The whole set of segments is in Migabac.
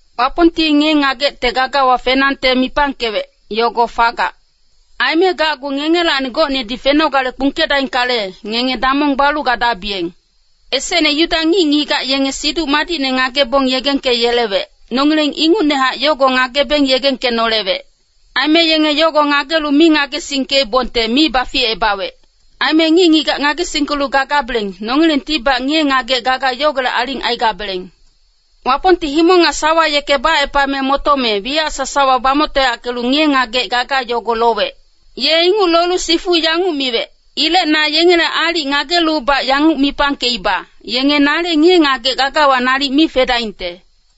Wapongti ngiye-ngagecte gagawa fenangte mipangkewec, yogo fagac. Aime gacgu ngengelacni gocnedi fenogale kpungkedaingkale, ngenge damong balu gadabiyeng. Esecne Yuda ngic-ngigac yenge Siduc Madicne ngagebong yegengkeyelewec, nongileng ingucnehac yogo ngagebeng yegengkenolewec. Aime yenge yogo ngagelu mi ngagesingkeibongte mi baficebawec. Aime ngic-ngigac ngagesingkelu gagabeleng, nongilengtibac ngiye-ngagec gaga yogolec aling aigabeleng. Wapongti himong nga sawa yeke bacepame motome, wiyac sasawa bamoctoyackelu ngiye-ngagec gaga yogo lowec. Ye inguc lolu sifu yanguc miwec, “Ilec na yengele aalic ngagelubac yanguc mipangkeiba, ‘Yenge nale ngiye-ngagec gagawa nalic mi fedaingte.’”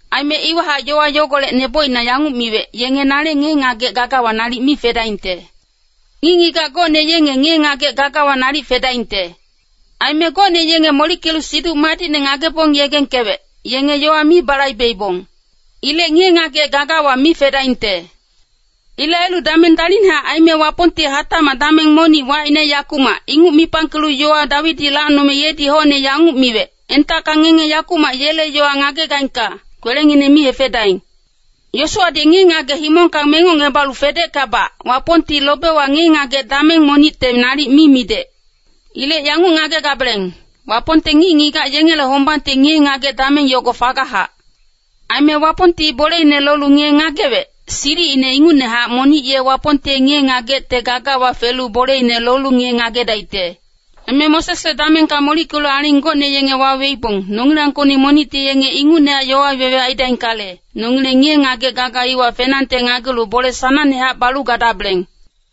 Aime iwahac yowa yogolec nebocina yanguc miwec, “Yenge nale ngiye-ngagec gagawa nalic mi fedaingte.” Ngic-ngigac gocne yenge ngiye-ngagec gagawa nalic fedaingte. Aime gocne yenge molickelu Siduc Madicne ngagebong yegengkewec, yenge yowa mi balaibeibong. Ilec ngiye-ngagec gagawa mi fedaingte. Ilec ailu dameng dalicnehac aime Wapongti hatacmac dameng monic wacine “yakumac” inguc mipangkelu yowa Dawidi lacnome yedi hocne yanguc miwec, “Entacka ngenge yakumac yele yowa ngagegaingka, kwelengineng mi hefedaing.” Yosuwadi ngiye-ngagec himongka mengocngebalu fedeckabac, Wapongti lobewa ngiye-ngagec dameng monicte nalic mi midec. Ilec yanguc ngagegabeleng, Wapongte ngic-ngigac yengele hombangte ngiye-ngagec dameng yogo fagachac. Aime Wapongti boleine lolu ngiye-ngagewec, silicine ingucnehac monic ye Wapongte ngiye-ngagecte gagawa felu boleine lolu ngiye-ngagedaicte. Aime Mosesle damengka molickelu aling gocne yenge waweibong, nongilangkocni monicti yenge ingucne yowa wewe aidaingkale, nongileng ngiye-ngagec gaga iwa fenangte ngagelu bole sanangnehac balu gadabeleng.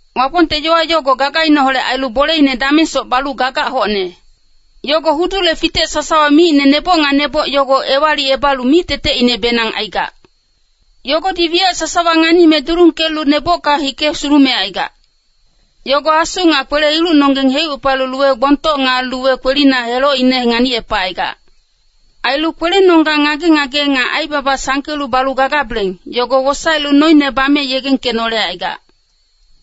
Wapongte yowa yogo gagaineholec ailu boleine damengsoc balu gagac hocne. Yogo hudule fitec sasawa micine neboc nga neboc yogo ewalicebalu mictetecinebenang aigac. Yogodi wiyac sasawa nganime dulungkelu nebocka hike sulumecaigac. Yogo asu nga kwele-ilucnonggeng heucepalu luwe gbongtoc nga luwe kwelina helocine nganicepacaigac. Ailu kwelenonggang ngage-ngage nga aibaba sangkelu balu gagabeleng, yogo wosaelu noine bame yegengkenolecaigac.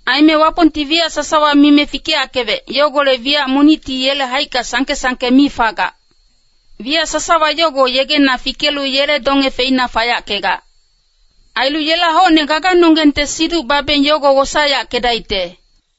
Aime Wapongti wiyac sasawa mime fikeyackewec, yogolec wiyac monicti yele haicka sangke-sangke mi fagac. Wiyac sasawa yogo yegena fikelu yele donge feina fayackegac. Ailu yela hocne gaganonggengte siduc babeng yogo wosaeyackedaicte.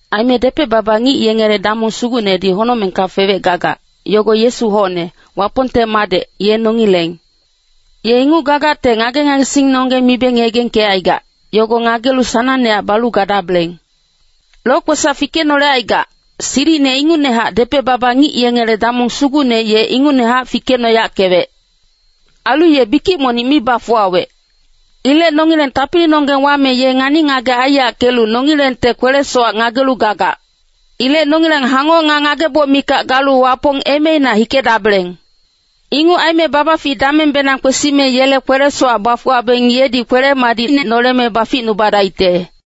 Aime depec-baba ngic yengele damong sugucnedi honocmengka fewec gagac, yogo Yesu hocne, Wapongte Madec, ye nongileng. Ye inguc gagacte ngage-ngagesingnonggeng mibeng yegengkecaigac, yogo ngagelu sanangnehac balu gadabeleng. Lokwesac fikenolecaigac, silicine ingucnehac depec-baba ngic yengele damong sugucne ye ingucnehac fikecnoyackewec. Ailu ye bikic monic mi bafuwawec. Ilec nongileng tapilinonggeng wame ye ngani-ngagec aiyackelu nongilengte kwele-sowac ngagelu gagac. Ilec nongileng hangoc nga ngageboc mikac galu Wapong emeina hikedabeleng. Inguc aime babafic damengbenang kwesime yele kwele-sowac bafuwabeng yedi kwele-madicine noleme baficnubadaicte.